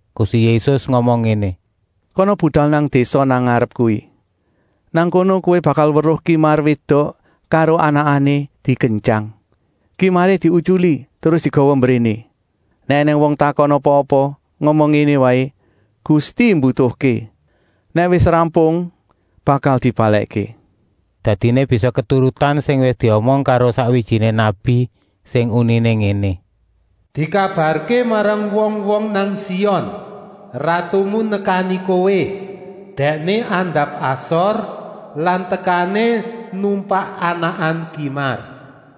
Gusti Yésus ngomong ngéné: “Kana budal nang désa nang ngarep kuwi. Nang kono kowé bakal weruh kimar wédok karo anakané dikentyang. Kimaré diutyuli terus digawa mbréné. Nèk ènèng wong takon apa-apa, ngomong ngéné waé: ‘Gusti mbutuhké. Nèk wis rampung, bakal dibalèkké.’” Dadiné bisa keturutan sing wis diomong karo sakwijiné nabi, sing uniné ngéné: “Dikabarké marang wong-wong nang Sion: Ratumu nekani kowé, Dèkné andap-asor lan tekané numpak anakan kimar.”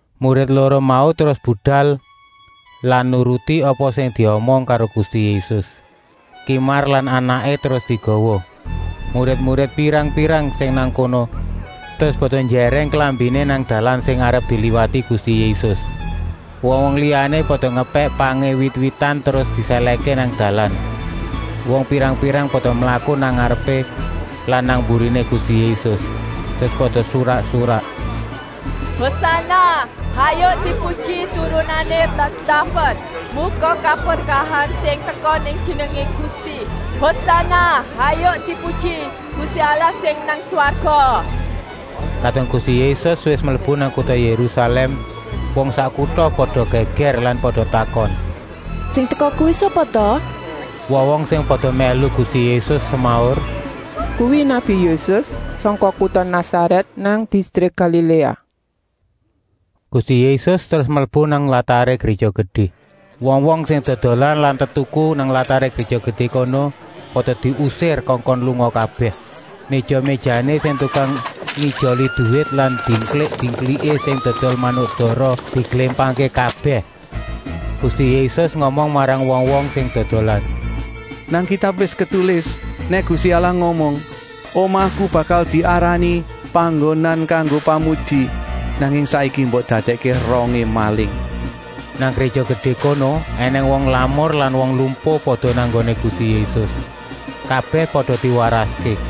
Murid loro mau terus budal lan nuruti apa sing diomong karo Gusti Yésus. Kimar lan anakané terus digawa. Murid-murid pirang-pirang sing nang kono terus pada njèrèng klambiné nang dalan sing arep diliwati Gusti Yésus. Wong-wong liyané pada ngepèk pangé wit-witan terus disèlèhké nang dalan. Wong pirang-pirang pada mlaku nang ngarepé lan nang mburiné Gusti Yésus, terus pada surak-surak: “Hosana, hayuk dipuji Turunané ratu Daved. Muga kaberkahan sing teka ing jenengé Gusti. Hosana, hayuk dipuji Gusti Allah sing nang swarga!” Kadung Gusti Yésus wis mlebu nang kuta Yérusalèm, wong sak kuta pada gègèr lan pada takon: “Sing teka kuwi sapa ta?” Wong-wong sing pada mèlu Gusti Yésus semaur: “Kuwi nabi Yésus, sangka kuta Nasarèt nang distrik Galiléa!” Gusti Yésus terus mlebu nang lataré Gréja Gedé. Wong-wong sing dodolan lan tetuku nang lataré Gréja Gedé kono pada diusir kongkon lunga kabèh. Méja-méjané sing tukang ngijoli duwit lan dingklik-dingkliké sing dodol manuk dara diglémpangké kabèh. Gusti Yésus ngomong marang wong-wong sing dodolan: “Nang Kitab wis ditulis nèk Gusti Allah ngomong: ‘Omahku bakal diarani panggonan kanggo pamuji,’ nanging saiki mbok dadèkké rongé maling.” Nang Gréja Gedé kono ènèng wong lamur lan wong lumpuh pada nang nggoné Gusti Yésus. Kabèh pada diwaraské.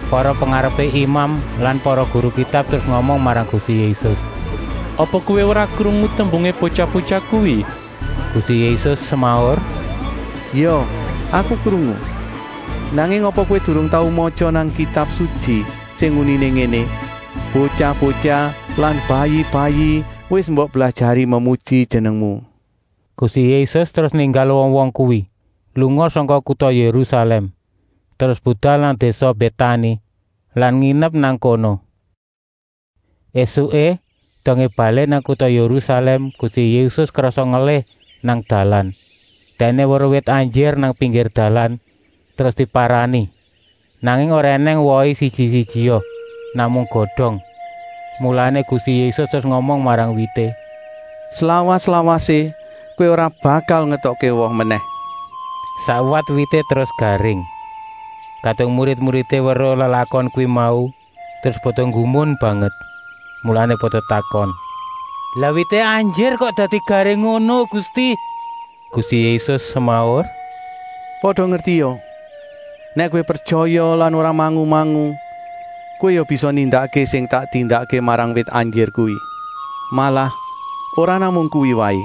Para pengarepé imam lan para guru Kitab terus ngomong marang Gusti Yésus: “Apa Kowé ora krungu tembungé botyah-botyah kuwi?” Gusti Yésus semaur: “Ya, Aku krungu. Nanging apa Kowé durung tau matya nang Kitab Sutyi, sing uniné ngéné: ‘Botyah-botyah lan bayi-bayi wis mbok blajari memuji Jenengmu.’” Gusti Yésus terus ninggal wong-wong kuwi, lunga sangka kuta Yérusalèm, terus budal nang désa Bétani lan nginep nang kono. Esuké, dongé balik nang kuta Yérusalèm, Gusti Yésus krasa ngelih nang dalan. Dèkné weruh wit anjir nang pinggir dalan, terus diparani. Nanging ora ènèng wohé siji-sijia, namung godong. Mulané Gusti Yésus terus ngomong marang wité: “Slawas-lawasé kowé ora bakal ngetokké woh menèh!” Sakwat wité terus garing. Kadung murid-muridé weruh lelakon kuwi mau, terus pada nggumun banget, mulané pada takon: “Lah wité anjir kok dadi garing ngono, Gusti?” Gusti Yésus semaur: “Pada ngertia, nèk kowé pretyaya lan ora mangu-mangu, kowé ya bisa nindakké sing tak tindakké marang wit anjir kuwi. Malah ora namung kuwi waé,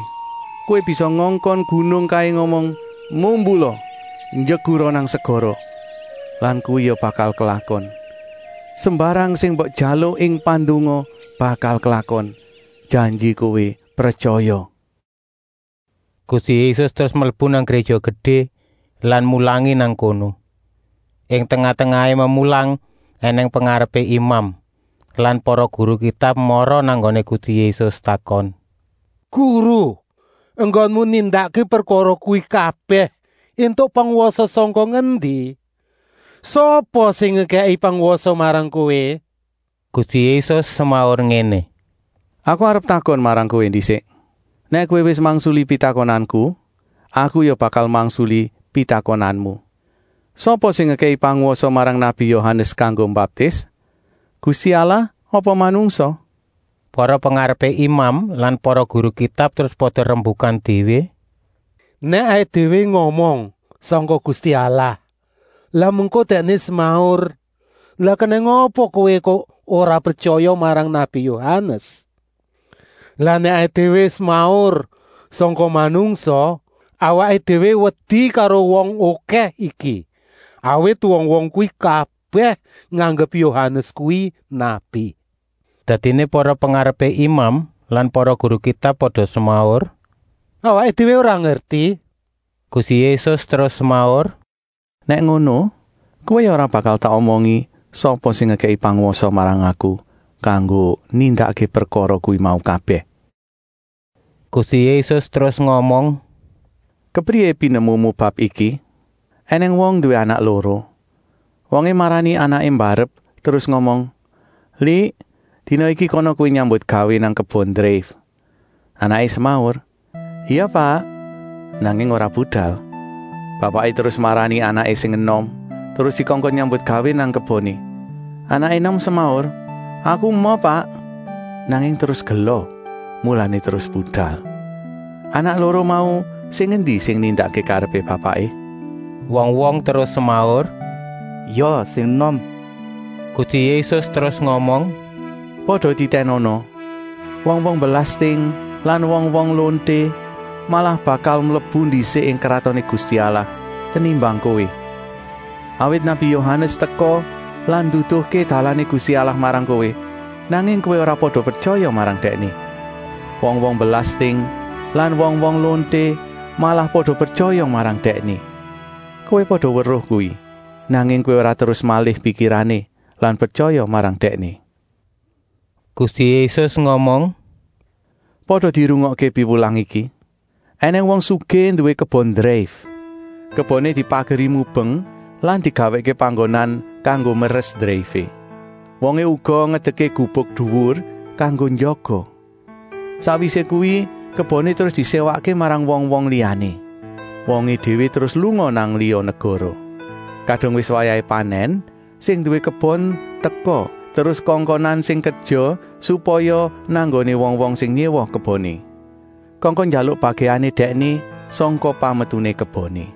kowé bisa ngongkon gunung kaé ngomong: ‘Mumbula, njegura nang segara,’ lan kuwi ya bakal klakon. Sembarang sing mbok jaluk ing pandonga bakal klakon, janji kowé pretyaya.” Gusti Yésus terus mlebu nang Gréja Gedé lan mulangi nang kono. Ing tengah-tengahé memulang ènèng pengarepé imam lan para guru Kitab mara nang nggoné Gusti Yésus takon: “Guru, enggonmu nindakké prekara kuwi kabèh éntuk pangwasa sangka ngendi? Sapa ta sing ngekèki pangwasa marang Kowé?” Gusti Yésus semaur ngéné: “Aku arep takon marang kowé ndisik. Nèk kowé wis mangsuli pitakonanku, Aku ya bakal mangsuli pitakonanmu. Sapa sing ngekèki pangwasa marang nabi Yohanes kanggo mbaptis? Gusti Allah apa manungsa?” Para pengarepé imam lan para guru Kitab terus pada rembukan déwé: “Nèk awaké déwé ngomong: ‘Sangka Gusti Allah,’ lah mengko Dèkné semaur: ‘Lah kenèng apa kowé kok ora pretyaya marang nabi Yohanes?’ Lah nèk awaké déwé semaur: ‘Sangka manungsa,’ awaké déwé wedi karo wong okèh iki, awit wong-wong kuwi kabèh nganggep Yohanes kuwi nabi.” Dadiné para pengarepé imam lan para guru Kitab pada semaur: “Awaké déwé ora ngerti!” Gusti Yésus terus semaur: “Nèk ngono, kowé ya ora bakal tak omongi sapa sing ngekèki pangwasa marang Aku kanggo nindakké prekara kuwi mau kabèh.” Gusti Yésus terus ngomong: “Kepriyé pinemumu bab iki? Enèng wong nduwé anak loro. Wongé marani anaké mbarep terus ngomong: ‘Lik, dina iki kana kowé nyambutgawé nang kebon dreif.’ Anaké semaur: ‘Ya Pak,’ nanging ora budal. Bapaké terus marani anaké sing enom, terus dikongkon nyambutgawé nang keboné. Anaké enom semaur: ‘Aku emoh Pak,’ nanging terus gela, mulané terus budal. Anak loro mau sing endi sing nindakké karepé bapaké?” Wong-wong terus semaur: “Ya sing enom.” Gusti Yésus terus ngomong: “Pada titènana, wong-wong belasting lan wong-wong lonté malah bakal mlebu ndisik ing Kratoné Gusti Allah tenimbang kowé. Awit nabi Yohanes teka lan nduduhké dalané Gusti Allah marang kowé, nanging kowé ora pada pretyaya marang dèkné. Wong-wong belasting lan wong-wong lonté malah pada pretyaya marang dèkné. Kowé pada weruh kuwi, nanging kowé ora terus malih pikirané lan pretyaya marang dèkné.” Gusti Yésus ngomong: “Pada dirungokké piwulang iki. Enèng wong sugih nduwé kebon dreif. Keboné dipageri mubeng lan digawèkké panggonan kanggo meres dreifé. Wongé uga ngedekké gubuk duwur kanggo njaga. Sakwisé kuwi keboné terus diséwakké marang wong-wong liyané. Wongé déwé terus lunga nang liya negara. Kadung wis wayahé panèn sing nduwé kebon teka terus kongkonan sing kerja supaya nang nggoné wong-wong sing nyéwa keboné. Kongkon njaluk bagèané dèkné sangka pametuné keboné.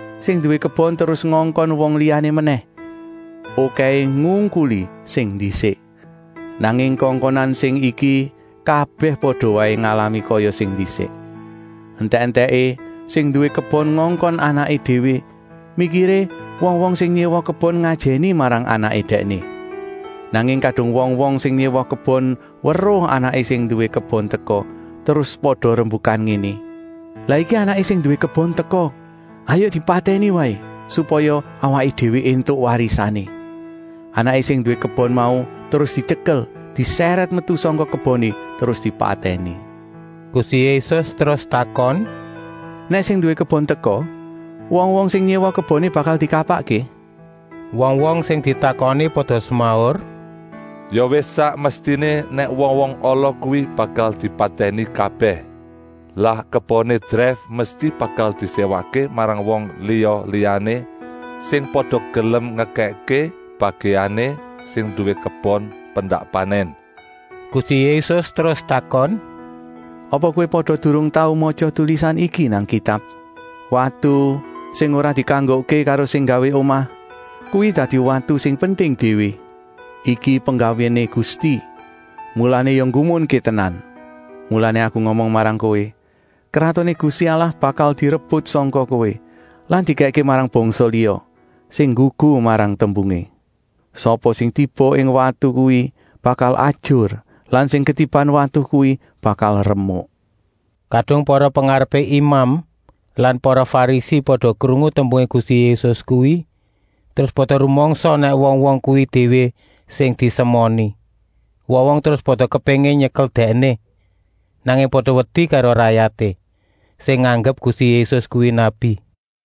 Sing nduwé kebon terus ngongkon wong liyané menèh, okèhé ngungkuli sing ndisik. Nanging kongkonan sing iki kabèh pada waé ngalami kaya sing ndisik. Entèk-entèké sing nduwé kebon ngongkon anaké déwé, mikiré wong-wong sing nyéwa kebon ngajèni marang anaké dèkné. Nanging kadung wong-wong sing nyéwa kebon weruh anaké sing nduwé kebon teka, terus pada rembukan ngéné: ‘Lah iki anaké sing nduwé kebon teka. Hayuk dipatèni waé, supaya awaké déwé éntuk warisané.’ Anaké sing nduwé kebon mau terus dityekel, disèrèt metu sangka keboné terus dipatèni.” Gusti Yésus terus takon: “Nèk sing nduwé kebon teka, wong-wong sing nyéwa keboné bakal dikapakké?” Wong-wong sing ditakoni pada semaur: “Ya wis sak mestiné nèk wong-wong ala kuwi bakal dipatèni kabèh. Lah keboné dreif mesti bakal diséwakké marang wong liya-liyané, sing pada gelem ngekèkké bagèané sing nduwé kebon pendak panèn.” Gusti Yésus terus takon: “Apa kowé pada durung tau matya tulisan iki nang Kitab: ‘Watu sing ora dikanggokké karo sing nggawé omah, kuwi dadi watu sing penting déwé. Iki penggawéné Gusti, mulané ya nggumunké tenan.’ Mulané Aku ngomong marang kowé: Kratoné Gusti Allah bakal direbut sangka kowé lan dikèkké marang bangsa liya, sing nggugu marang tembungé. ( Sapa sing tiba ing watu kuwi bakal ajur lan sing ketiban watu kuwi bakal remuk.)” Kadung para pengarepé imam lan para Farisi pada krungu tembungé Gusti Yésus kuwi, terus pada rumangsa nèk wong-wong kuwi déwé sing disemoni. Wong-wong terus pada kepéngin nyekel Dèkné, nanging pada wedi karo rayaté, sing nganggep Gusti Yésus kuwi nabi.